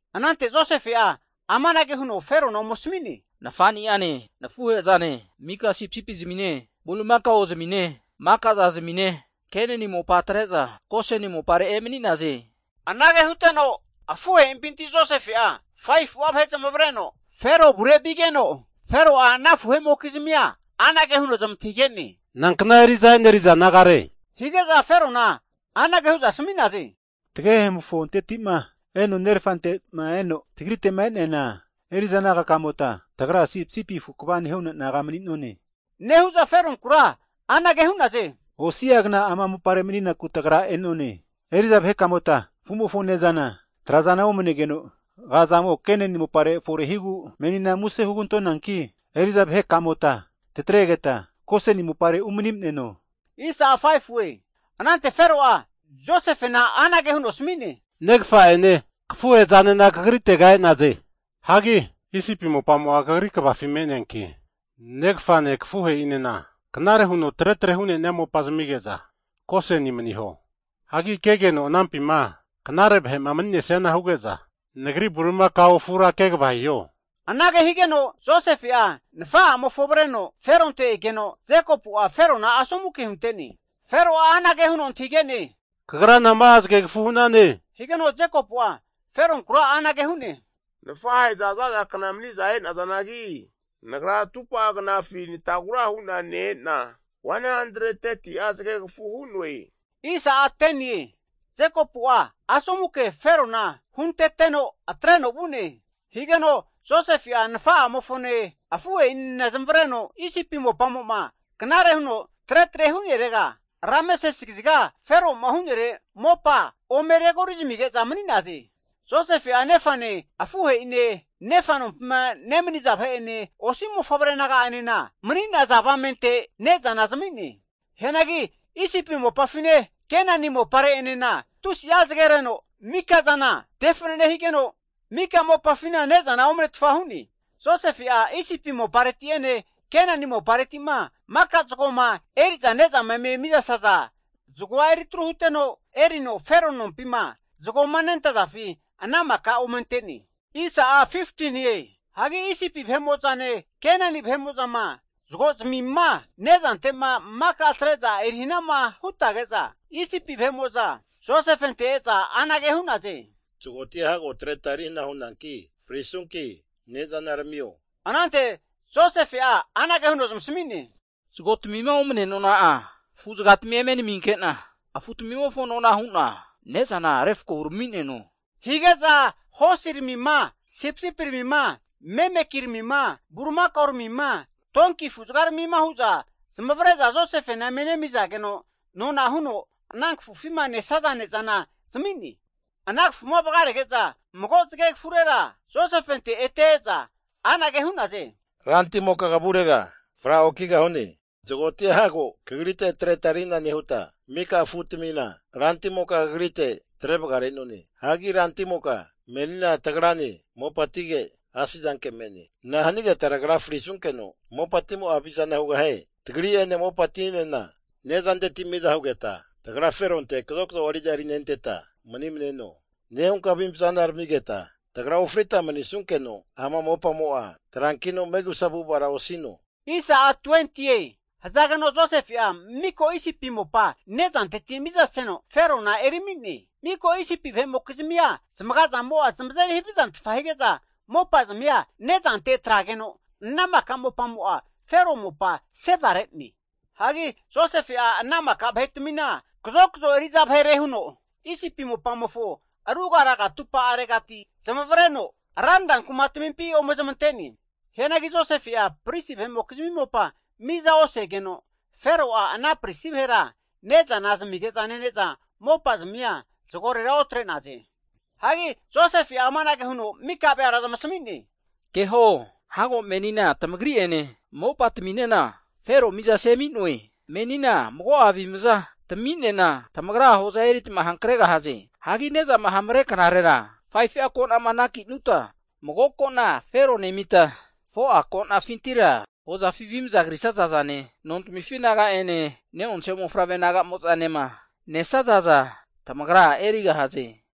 Anante Josefe'a amanage huno Ferona ome asami'ne, Nafani'ane, nafuhe'zane maka sipisipi'zamine, Bulimaka'ozamine, maka zazmine Kenani mopa atre'za Goseni mopare emani'naze. Anage huteno afuhe'impinti Josefe'a 5fu'a vahe zamavareno Fero avure vigeno, Fero'a ana afuhe'mokizmia anage huno zamantahige'ne, Nankna eri'za e'neriza nagare? Hige'za Ferona anage hu'za asami'naze, Tagehemofonteti'ma eno nerafante'ma eno tagrite'ma e'neana eri'za naga kamota tagra sipisipi afu kva nehu'na naga mani'none, nehu'za Feronkura anage hu'naze, Osi'a gna ama mopare maninaku tagra e'none. Eri'za vahekamota afu'mofo ne'zana, trazana omanegeno aga'zamo Kenani mopare forehigu, menina muse (plis) hugantonanki, eri'za vahekamota tatregeta Goseni mopare umani maneno. Anante Fero'a Josefena anage huno asmine, Negafa'ene, kafuhe'zanena kagritega e'naze. Hagi Isipi mopamo'a kegava hankeno me'neanki, negafane kafuhe'inena knare huno tre tre hu'nenia mopa zamige'za Goseni maniho. Hagi kegeno anampima knare vahe'ma mani'nesiana huge'za, nagri bulimakao afura kegava hiho. Anage higeno Josefe'a nafa'amofo avreno Feronte egeno, Jekopu'a asomu ke Ferona hunte'ne. Fero'a anage huno antahige'ne, Kagra nama'a zagegafu hu'nane? Higeno Jekopu'a Feronkura anage hu'ne, Nafahe'za zaza kna maniza e'nazanagi, nagra atupa'a knafi natagura huna ne-ena, 130'a zagegafu hu'noe. Jekopu'a asomu ke Ferona hunteteno atreno vu'ne. Higeno Josefe'a nafa'amofone, afuhe'inena zamavareno Isipi mopamo'ma knare huno tretre hu'nerega, Rameses kaziga Fero'ma hu'nere mopa ome regori zamige'za mani'naze. Josefe'a nefane, afuhe'ine, nefa nompima nemaniza vahe'ene, osi mofavre naga'enena, mani'naza avamente ne'zana zami'ne. Hianagi Isipi mopafine, Kenani mopare'enena tusi'a zagereno mikazana tefanane higeno, mika mopafina ne'zana omnetfa hu'ne. Josefe'a Isipi mopareti'ene Kenani mopareti'ma maka zagoma eri'za ne'zama eme mizasaza zagoa eritru huteno, erino Fero nompima zagoma nentazafi ana mika ome ante'ne. Hagi Isipi vahe'mo'zane Kenani vahe'mo'zama zagozmima ne'zante'ma maka atre'za eri hanama hutage'za, Isipi vahe'mo'za Josefente e'za anage hu'naze, zagotia hago atreta erihna hu'nonanki, frisunki ne'zanaramio. Anante Josefe'a anage huno zamasami'ne, Zago tamima omanea nona'a, afu'zagatmi eme naminke'na afu tamimofo nona hu'na ne'zana refko hurami'neno. Hige'za hosiramima, sipisipiramima, memekiramima bulimakaoramima, donki afu'zagaramima hu'za zamavare'za Josefena eme nemizageno nona huno, ana kafufima nesaza ne'zana zami'ne. Ana kafuma vagarege'za mago zagegafurera Josefente ete e'za anage hu'naze, rantimoka kavurera fra okigahune. Zagotia hago kagrite atreta eri hana nehuta, mika afutamina ranti'moka kagrite atre vagare'none. Hagi rantimoka menina tagrane mopatige asizanke me'ne. Nahanigeta tagra frisunkeno mopatimo'a havizana hugahie? Tagri'ene mopatinena nezanteti miza hugeta, tagra Feronte kazokazo eri'za erinenteta manimneno. Nehunka avimza tamigeta tagra ofrita mani'nesunkeno, ama mopamo'a, trankino megusa avu'avara osino. Hazageno Josefe'a mika Isipi mopa ne'zanteti mizaseno Ferona eri ami'ne. Mika Isipi vahe'mokizmia zamaga'zamo'a zamazeri havizantfa hige'za mopa zamia ne'zante atrageno, ana mika mopamo'a Fero mopa sevare'ne. Hagi Josefe'a ana mika vahetamina kazokazo eri'za vahere huno, Isipi mopamofo ruga raga atupa'aregati zamavareno, ranra kumatmimpi ome zamante'ne. Hianagi Josefe'a pristi vahe'mokizmi mopa miza osegeno, Fero'a ana pristi vahera ne'zana zamige'za nene'za mopa'zmia zagorera otre'naze. Hagi Josefe'a amanage huno maka veara zamasmi'ne, Keho, hago menina tamagri'ene mopatmi'nena Fero miza semi'noe. Menina mago'a avimza timinena tamagra hoza eritma hankregahaze. Hagi ne'zama hamare knarera 5fu'a ko'nama anaki'nuta, mago ko'na Fero nemita, 4'a ko'nafintira hozafi avi krisaza zane, nontamifi naga'ene ne'onse mofavre naga'mozanema nesazaza tamagra erigahaze.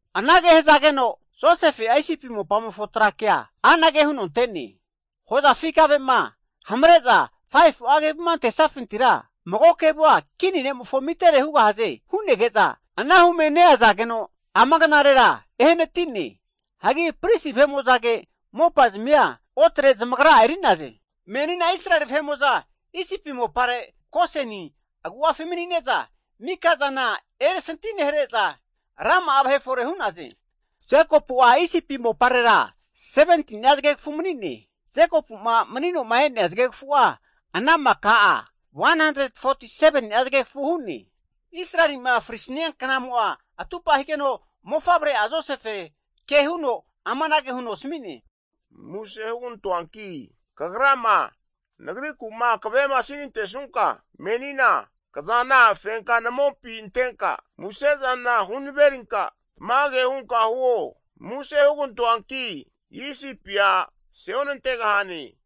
Anage hazageno, Josefe'a Isipi mopamofo tra kea anage huno ante'ne, Hozafi kave'ma hamare'za 5fu'a kevuma antesafintira mago kevua kini ne'mofo amitere hugahaze hu'nege'za, ana hume neazageno eno ama knarera ehanati'ne. Hagi pristi vahe'mo'zage mopazmia otre zamagra'a eri'naze. Menina Israeli vahe'mo'za Isipi mopare, Goseni agu'afi mani'ne'za, mika zana erisanti nehare'za, rama'a vahe fore hu'naze. Jekopu'a Isipi moparera 17ni'a zagegafu mani'ne. Jekopu'ma manino'ma e'nea zagegafu'a ana maka'a 147ni'a zagegafu hu'ne. Israeli'ma (Jekopu) frisnia knamo atupa higeno, mofavre'a Josefe ke huno amanage huno asmi'ne, Muse (plis) hugantoanki kagrama nagriku'ma kave'ma sinante'sunka, menina kazana fenka namopi antenka musezana hunaverinka tamage hunka huo. Muse (plis) hugantoanki Isipia ase onantegahane.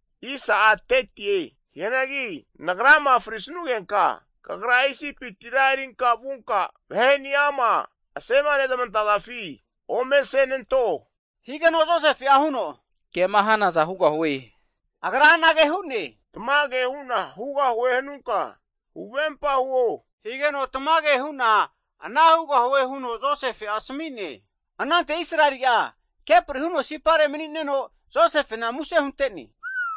Hianagi nagrama frisnugenka, kagra Isipitira erinka vunka vahe'niama asema nezmantafi ome asenanto. Higeno Josefe'a huno, kema hanaza hugahue. Agra anage hu'ne, Tamage hu'na hugahue hanunka, huvempa huo, higeno tamage hu'na ana hugahue huno Josefe'a asmi'ne. Anante Israeli'a (Jekopu) kepri huno sipare mani'neno Josefena muse hunte'ne.